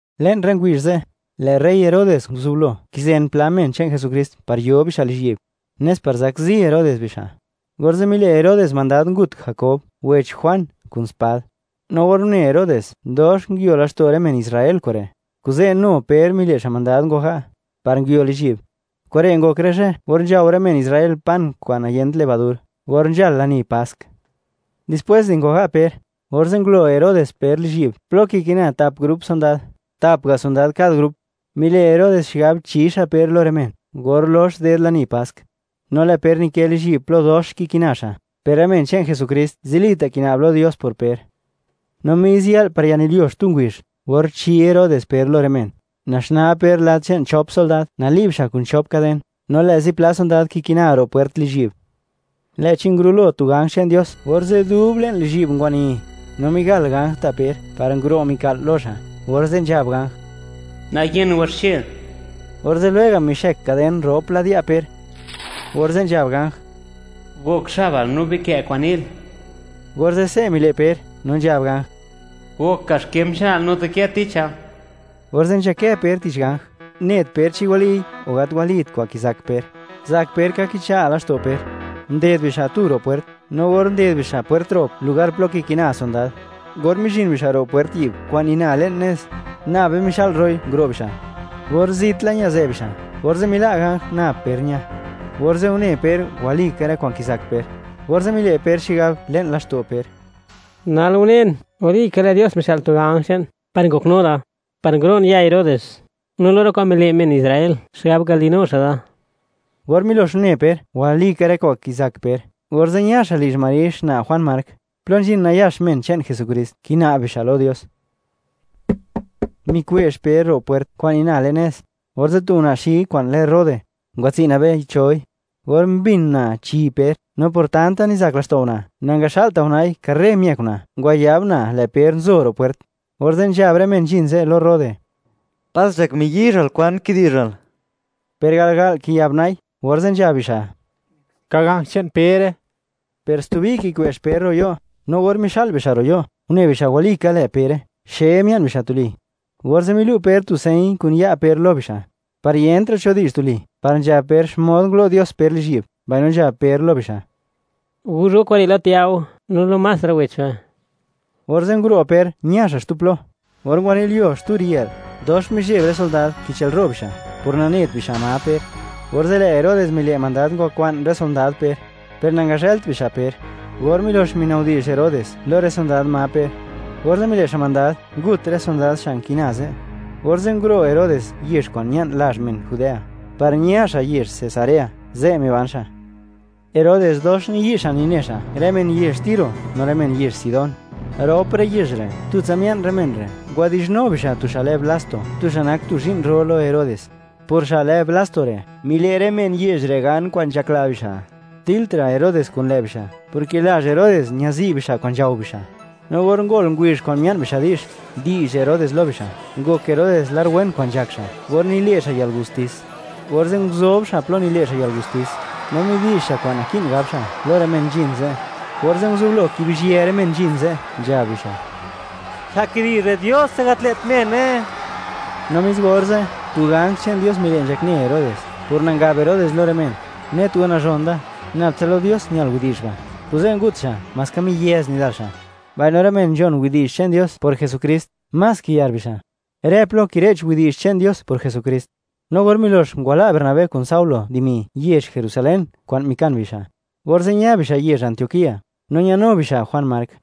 Le'n rë ngubizh ze', lë' rey Herodes nguzublo kizen pla men che'n Jesukrist par yo bixa' lizhyi'b, nes par zakzi rey Herodes bixa'. Orze' mile' Herodes mandad ngut Jakob, wech Juan, kun spad. No or une Herodes, dox nguio laxto' rë men Israel kure', kuze' nu Per mile' xa' mandad, ngwaga', par nguio lizhyi'b. Kure' ngok rë zhë or nzhao rë men Israel pan kwa'n niyent levadur, or nzhal lani Pask. Dispwés di ngwaga' Per, orze' ngulo Herodes Per lizhyi'b, plo kikina tap grup sondad, tap ga' sondad kad grup. Mile' Herodes xigab chi xa' Per lo rë men, or lox ded lani Pask. No lë' Per nikë lizhyi'b plo dox kikina xa', per rë men che'n Jesukrist zilita' kina'b lo Dios por Per. No mis yë'l par yanilyuo xtu ngubizh, or chi Herodes Per lo rë men, naxnaa Per lad che'n chop sondad, nali'b xa' kun chop kaden, no lë' zipla sondad kikina ro' pwert lizhyi'b. Lë'chi ngurulo tu ganj che'n Dios, orze' dub le'n lizhyi'b ngwani, no migal ganj ta' Per, par nguro' mika'l lo xa', orze' nzhab ganj: ―¡Nayen waxche! Orze' lwega' mixëk kaden rop lad ya' Per, orze' nzhab ganj: ―¡Gok xabal, no bikë' kwa'n ni'l! Orze', se' mile' Per, no nzhab ganj: ―¡Gok kaxkem che'nal, no dikë ticha! Orze' nzhakë Per tich ganj, net Per chi waliy o gat walit kwa'n kizak Per; zak Per ka kicha' laxto' Per. Nded bixa' tu ro' pwert, no or nded bixa' pwert rop lugar plo kikina sondad; or mizhin bixa' ro' pwert yi'b kwa'n nina le'n nez, nabe mixa'l ro'i, nguro' bixa'. Or zit la ñazë bixa', orze' mila' ganj, nab Per ña. Orze' une Per, walika rë kwa'n kizak Per, orze' mile' Per xigab le'n laxto' Per: ―Nal unen, walika lë' Dios mixë'l tu ganj che'n par ngoknu da, par nguro'n ya' Herodes, no lo rë kwa'n mile' men Israel xigab ngale'nu xa' da. Or milox une Per, walika rë kwa'n kizak Per, orze' ña xa' lizh Mari xna' Juan Mark, plo nzhin nayax men che'n Jesukrist, kina'b bixa' lo Dios. Mikwe'zh Per ro' pwert, kwa'n nina le'n nez, orze' tu una' xi kwa'n lë Rode, ngwatsi' nabei choi. Or mbin una' chi Per, no por tanta nizak laxto' una', nangaxa'lta' una'i; karre miëk una', ngwayab una', lë' Per nzo ro' pwert. Orze' nzhab rë men nzhin ze' lo Rode: ―¡Pas nzhak miyizhal!, ¿kwan kidi'zhal? Per garga'l kiyab una'i, orze' nzhab bixa': ―Ka ganj che'n Pere. Per stubi kikwe'zh Per ro' yo', no or mixa'l bixa' ro' yo', une bixa' walika lë' Pere, xe mia'n bixa' tuli. Orze' milu' Per tu señ kun ya' Per lo bixa', par yentra' cho di'zh tuli, par nzhab Per xmod ngulo' Dios Per lizhyi'b, mbaino nzhab Per lo bixa': ―Guzh go kure' lo Jakob, no lo más rë wech be. Orze' nguro' Per, ña xa' xtu plo. Or ngwanilyuo xtu riyë'l, dox mizheb rë sondad, kichëlro' bixa' por nanet bixa' ma Per. Orze' lë' Herodes mile' mandad ngwakwa'n rë sondad Per; per nangazhëlt bixa' Per. Or milox minabdi'zh Herodes lo rë sondad ma Per, orze' mile' xa' mandad, ngut rë sondad xa' nki'na ze'. Orze' nguro' Herodes yezh kwa'n ña'n lazh men Judea, par ña xa' yezh Cesarea, ze' miban xa'. Herodes dox niyi' xa' nine xa' rë men yezh Tiro no rë men yezh Sidón. Rop rë yezh re', tutsa mia'n rë men re', ngwadi'zhnu bixa' tu xa' lë Blasto, tu xa' nak tu zhi'n ro lo Herodes. Por xa' lë Blasto re', mile' rë men yezh re' gan kwa'n nzhakla bixa', diltra' Herodes kun lë' bixa', porke lazh Herodes ñazi' bixa' kwa'n nzhao bixa'. No or ngol ngubizh kwa'n mia'n bixa' di'zh, di'zh Herodes lo bixa', ngok Herodes lar wen kwa'n nzhak xa' or nile' xa' yalgustis, orze' nguzob xa' plo nile' xa' yalgustis; no midi'zh xa' kwa'n naki'n gab xa', lo rë men nzhin ze'. Orze', nguzublo kibizhië rë men nzhin ze', nzhab bixa': ―¡Xa' kidi'zh re', diose, gat lë't mene! No mis orze', tu ganj che'n Dios mile' nzhakne Herodes, por nangab Herodes lo rë men: “Net go nazhon da; nab tsa lo Dios ñal widi'zh ba'”; kuze' ngut xa', maska miyëz nidal xa'. Mbaino rë men nzhon widi'zh che'n Dios por Jesukrist, más kiyar bixa', rë plo kire'ch widi'zh che'n Dios por Jesukrist. No or milox ngwala' Bernabé kun Saulo dimi yezh Jerusalén kwa'n mikan bixa', orze' ña bixa' yezh Antioquía, no ñanu bixa' Juan Mark.